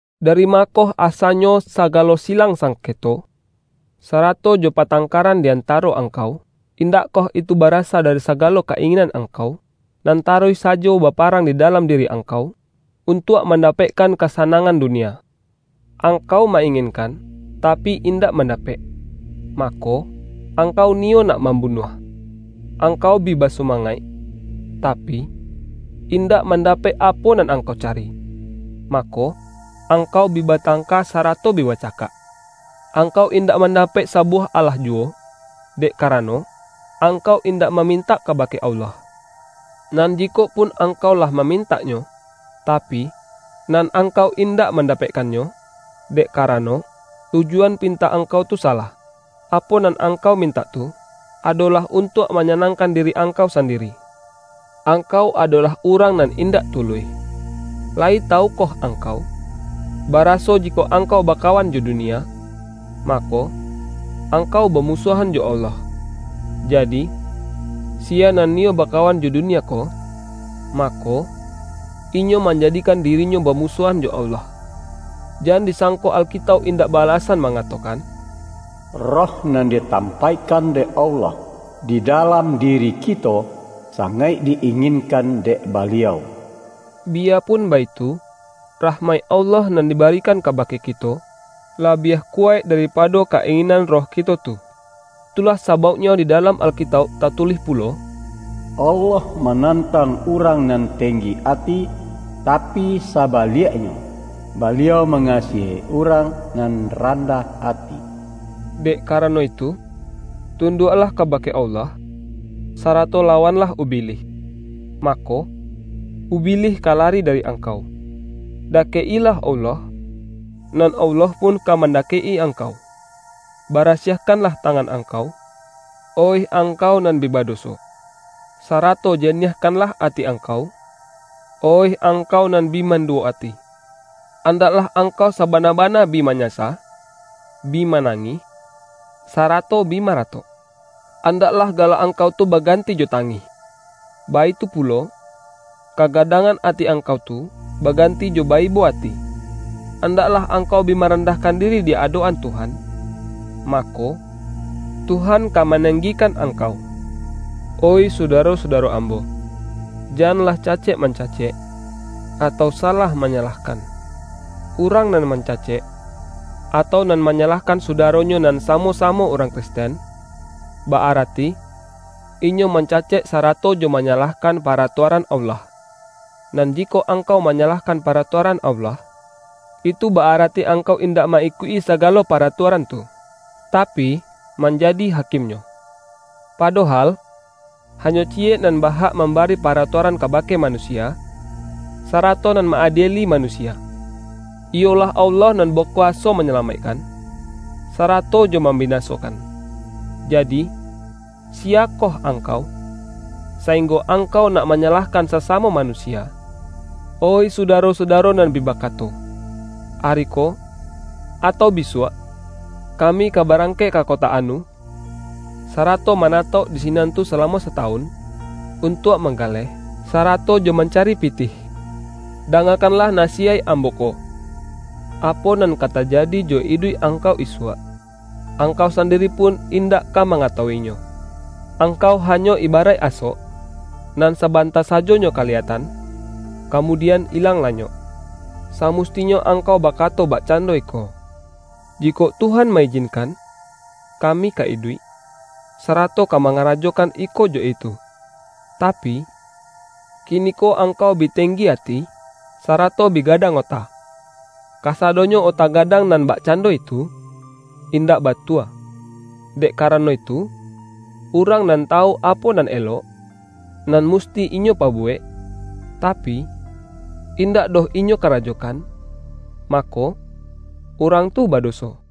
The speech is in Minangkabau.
Dari ma koh asanyo sagalo silang sangketo, sarato jo patangkaran di antaro angkau? Indakkoh itu ba-rasa dari sagalo ka-inginan angkau, nan taruih sajo baparang di dalam di-ri angkau, untuak mandapekkan kasa-nangan dunia! Angkau ma-inginkan, tapi indak mandapek, mako, angkau niyo nak mambunuah! Angkau bi ba-sumangaik, tapi, indak mandapek apo nan angkau cari, mako, angkau bi batangka sarato bi bacakak. Ang-kau indak mandapek sabuwah alah juwo, dek karano, angkau indak ma-mintak kabake Allah. Nan jikok pun angkau lah mamintaknyo, tapi, nan angkau indak mandapekkannyo, dek karano, tujuan pintak angkau tu sa-lah; apo nan angkau mintak tu, ado-lah untuak manyanangkan diri ang-kau sandiri. Angkau adolah urang nan indak tuluih! Layi tawukoh ang-kau, baraso jikok angkau bakawan jo dunia, mako, angkau bamusuahan jo Allah? Jadi, siya nan niyo bakawan jo dunia ko, mako, inyo manjadikan di-rinyo bamusuahan jo Allah. Jan di-sangko Alkitauk indak ba-alasan ma-ngatokan,”Roh nan ditampaikkan dek Allah di dalam diri kito, sangaik di-inginkan dek Baliau.” Biyapun baitu, rahmaik Allah nan dibarikan kabake kito, labiah kuwaik daripado ka-inginan roh kito tu. Itulah sabauk-nyo di dalam Alkitauk tatulih pulo,”Allah manantang urang nan tenggi ati, tapi sabaliaknyo, Baliau manga-siahi urang nan randah ati.” Dek karano itu, tunduaklah kaba-ke Allah, sarato lawanlah Ubilih, ma-ko, Ubilih ka lari dari angkau. Da-kek-ilah Allah, nan Allah pun ka mandakek-i angkau. Barasiahkanlah tangan angkau, oih angkau nan bi badoso! Sarato janiahkanlah ati ang-kau, oih angkau nan bi manduwo ati! Andaklah angkau sabana-bana bi manyasa, bi manangih, sarato bi ma-ratok; andaklah galak angkau tu ba-ganti jo tangih, baitu pulo, kagadang-an ati angkau tu, baganti jo ba-ibo ati! Andaklah angkau bi marandahkan diri di adok-an Tuhan, mako, Tuhan ka manenggikan angkau. Oih sudaro-sudaro ambo, janlah cacek mancacek, atau salah manya-lahkan. Urang nan mancacek, atau nan manyalahkan sudaronyo nan sa-mo-samo urang Kristen, ba-arati, inyo mancacek sarato jo manyalahkan pa-ratuaran Allah. Nan jikok angkau ma-nyalahkan paratuaran Allah, itu ba-arati angkau indak ma-ikuik-i sagalo paratuaran tu, tapi, manjadi hakim-nyo. Padohal, hanyo ciyek nan ba-hak mambari paratuaran kabake ma-nusia, sarato nan ma-adieli manusia. Iyolah Allah nan bakuwaso manya-lamaikkan, sarato jo mambinasokan. Jadi, siyakoh angkau, sainggo angkau nak manyalahkan sasamo manusia? Oih sudaro-sudaro nan bi ba-kato,”Ari ko, atau bisuak, kami ka barangkek ka kota anu, sarato ma-natauk di sinan tu salamo satawun, untuak manggaleh, sarato jo mancari pitih,” — dangakanlah nasiyaik ambo ko. Apo nan ka tajadi jo iduik ang-kau isuak, angkau sandiri pun indak ka mangatawu-inyo! Angkau hanyo ibaraik asok, nan sabanta sajonyo kaliyatan, kamudian ilang lanyok. Sa-mustinyo angkau bakato bakcando iko,”Jikok Tuhan ma-ijinkan, kami ka iduik, sarato ka mangarajokan iko jo itu.” Tapi, kiniko angkau bi tenggi ati, sarato bi gadang ota. Kasadonyo ota gadang nan bakcando itu, indak batua. Dek karano itu, urang nan tawu apo nan elok, nan musti inyo pabu-wek, tapi, indak doh inyo karajokan, mako, urang tu badoso.